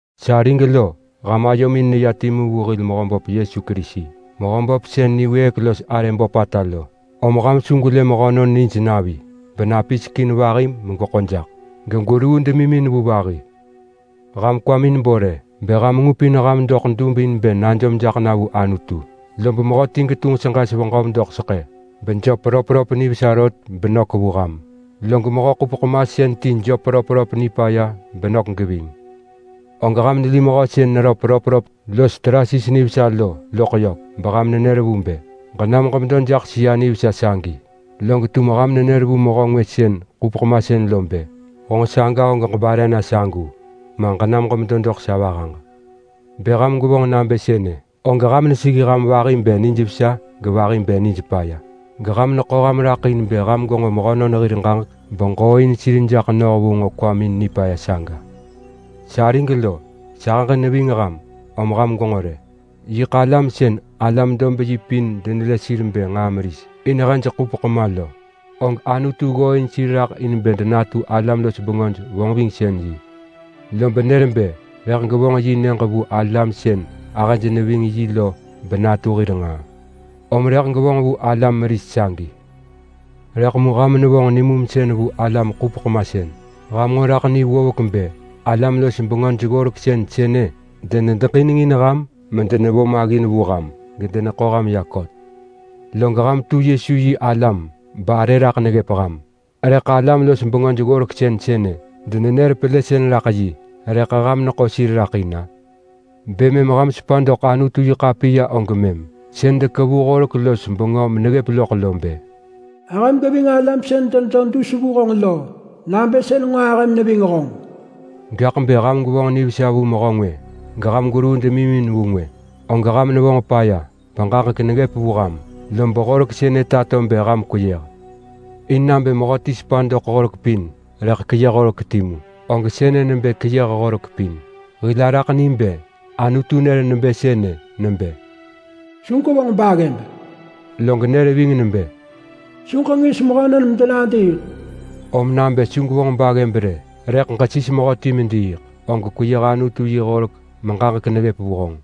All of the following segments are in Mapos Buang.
Sarig lo! Ham ayomin neya timu vu hil Mehöböp Yesu Kerisi, Mehöböp sën niwëëk los arë böpata lo. Om ham su gwelë mehönon nij navi benapisek in vahi megweḳo jaḳ, gegweruu demimin vu vahi. Ham kwamin bo rë! Bë ham ngupin ham doḳ dub in bë najom jaḳ na vu Anutu, lob mehöti getunġ seġes veġöv doḳ seḳë bejöp röpröp nivesa rot benök vu ham, log mehö-ḳupeḳ-masën ti jöp röpröp nipaya benök geving, og ham neli mehö sën neröp röpröp los trases nivesa lo loḳ yök beham nenër vu bë, “Ġenam ġemedo jaḳ sëa nivesa sagi!” Log tum ham nenër vu mehö ngwë sën ḳupeḳ masën lo bë, “Honġ saga og ġebare na sagu!” ma, “Ġenam ġemedo doḳ sa vahaġ!” Bë ham gwevonġ nabë sënë, og ham neseggi ham vahi bë nijvesa gevahi bë nijpaya, geham neḳo ham raḳ in bë ham gwenġo mehönon hir ġaġek beġooin sir jaḳ noh vu nġo kwamin nipaya saga. Sarig lo, sahëġ neving ham, om ham gwenġo rë! Yiḳ alam sën alam-dob-yi pin denelë sir bë nġaa meris in hej ḳupeḳ ma lo, og Anutu ggooin sir raḳ in bë denatu alam-los-bengöj-vonġvingsën-yi. Lob nër bë rëḳ gevonġ yi Nyëġ vu alam sën ahëj neving yi lo benatu hir nġaa, om rëḳ gevonġ vu alam meris sagi. Rëḳ mu ham nevonġ nimumsën vu alam-ḳupeḳ-masën! Ham nġo raḳ ni ggovek bë alam-los-bengöj-ggoreksën sënë denedeġinengin ham medenevo maggin vu ham, gedeneḳo ham ya kot. Log ham tu Yesu-yi-alam barë raḳ neggëp ham, rëḳ alam-los-bengöj-ggoreksën sënë denenër pelësën raḳ yi, rëḳ ham neḳo sir raḳ in-a? Bë mëm ham sepa doḳ Anutu-yi-ḳapiya og mëm. Sën dekevu horek los bengö meneggëp loḳ lo bë, “Ahëm geving alam sën denedo dus vu honġ lo nabë sën nġo ahëm neving honġ.” Gaḳ bë ham gwevonġ nivesa vu mehö ngwë geham gweruu demimin vu ngwë, og ham nevonġ paya beġaġek neggëp vu ham. Lob horek sënë tato bë ham kweyëh. In nabë mehöti sepa doḳ horek pin rëḳ keyëh horek timu, og sënë nebë keyëh horek pin. Hil araḳ ni bë Anutu nër nebë sënë nebë, “Su gwevonġ baggëb!” Log nër ving nebë, “Su ġengis mehönon medenadiiḳ!” Om nabë su ġevonġ baggëb rë, rëḳ ġesis mehöti mediiḳ, og kweyëh Anutu yi horek meġaġek neggëp vu honġ.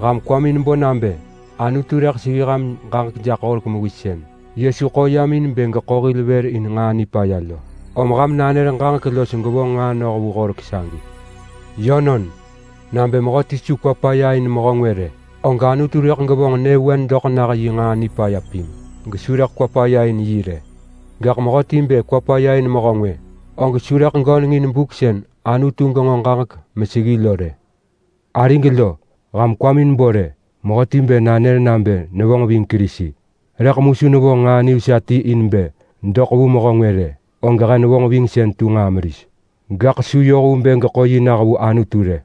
Ham kwamin bo nabë Anutu rëḳ seggi ham ġaġek jaḳ horek mewis sën Yesu ḳo yam in bë geḳo hil vër in nġaa nipaya lo. Om ham nanër ġaġek los gwevonġ nġaa noh vu horek sagi. Yönon! Nabë mehöti su kwa paya in mehö ngwë rë, og Anutu rëḳ gevonġ nyëvewen doḳ nah yi nġaa nipaya pin gesu rëḳ kwa paya in yi rë. Gaḳ mehöti bë kwa paya in mehö ngwë, og su rëḳ gönengin buk sën Anutu genġo ġaġek meseggi lo rë. Arig lo! Ham kwamin bo rë! Mehöti bë nanër nabë nevonġ ving Kerisi rëḳ mu su vonġ nġaa nivesa ti in bë doḳ vu mehö ngwë rë, og yi vonġvingsën tu nġaa meris. Gaḳ su yoh vu bë geḳo yi nah vu Anutu rë.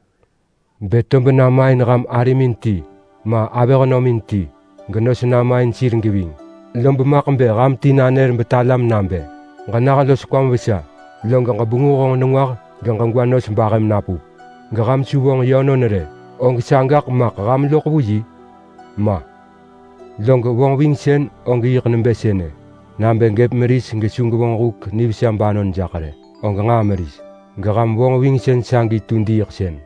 Bë tob nama in ham arimin ti, ma avëhnömin ti, genos namain sir geving, lob maḳ bë ham ti nanër betalam nabë, “Ġenah los kwam vesa! Log ġebenguh honġ nengwah geġegwa nos bahëm napup!” Geham su vonġ yönon rë, og sagaḳ maḳ ham loḳ vu yi? Ma! Log vonġvingsën og yiḳ nebë sënë! Nabë gëp meris gesu gevonġ huk nivesa banon jaḳ rë, og nġaa meris geham vonġvingsën sagi tu diiḳsën.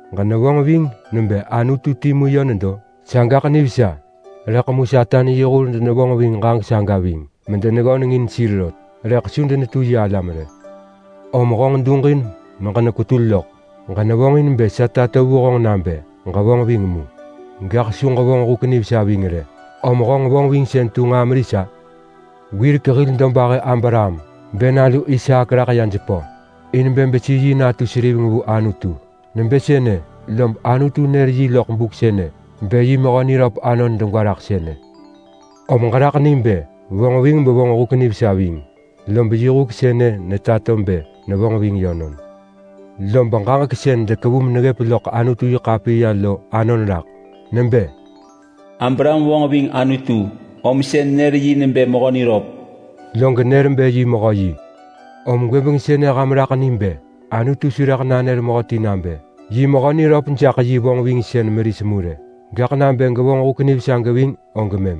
Ġenevonġ ving nebë Anutu timu yö nedo? Sagaḳ nivesa! Rëḳ mu Satan yi hur denevonġ ving ġaġek saga ving medeneggönengin sir rot, rëḳ su denetu yi alam rë! Om honġ duġin meġenek-wetul lok! Ġenevonġin bë sa tato vu honġ nabë ġevonġ ving mu, gaḳ su ġevonġ huk nivesa ving rë, om honġ vonġvingsën tu nġaa meris-a? Wirek hil dobahë Abraham bë nalu Isaak raḳ ya jepö in bë besi yi natu seriveng vu Anutu. Nebë sënë lom Anutu nër yi loḳ buk sënë bë yi mehö niröp anon, og yiḳ degwa raḳ sënë. Om ġeraḳ ni bë vonġ ving mevonġ huk nivesa ving. Lob yi huk sënë netato bë nevonġ ving yönon. Lob ġaġek sën dekevu meneggëp loḳ Anutu-yi-ḳapiya lo anon raḳ. Nebë, “Abraham vonġ ving Anutu om sën nër yi nebë mehö niröp.” Log nër bë yi mehö yi. Om gwëbeng sënë ham raḳ ni bë Anutu su rëḳ nanër mehöti nabë yi mehö niröp jaḳ yi vonġvingsën meris mu rë, gaḳ nabë gevonġ huk nivesa geving og mëm.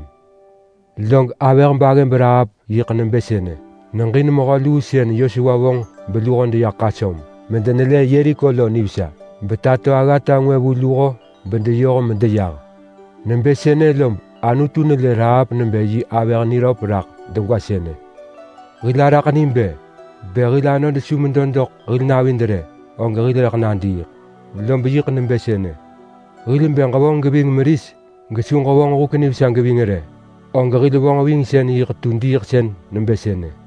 Log avëh-baggëb Rahap yiḳ nebë sënë! Neġin mehö luu sën Yosua vonġ beluho deya ḳasöm medenelë Yeriko lo nivesa, betato aggata ngwë vu luho bedeyoh medeyah. Nebë sënë lob Anutu nelë Rahap nebë yi avëh niröp raḳ degwa sënë. Hil araḳ ni bë: Bë hil anod su medo doḳ hil navid rë, og hil rëḳ nadiiḳ. Lob yiḳ nebë sënë. Hil bë ġevonġ geving meris gesu ġevonġ huk nivesa geving rë, og hil vonġvingsën yiḳ tu diiḳsën nebë sënë.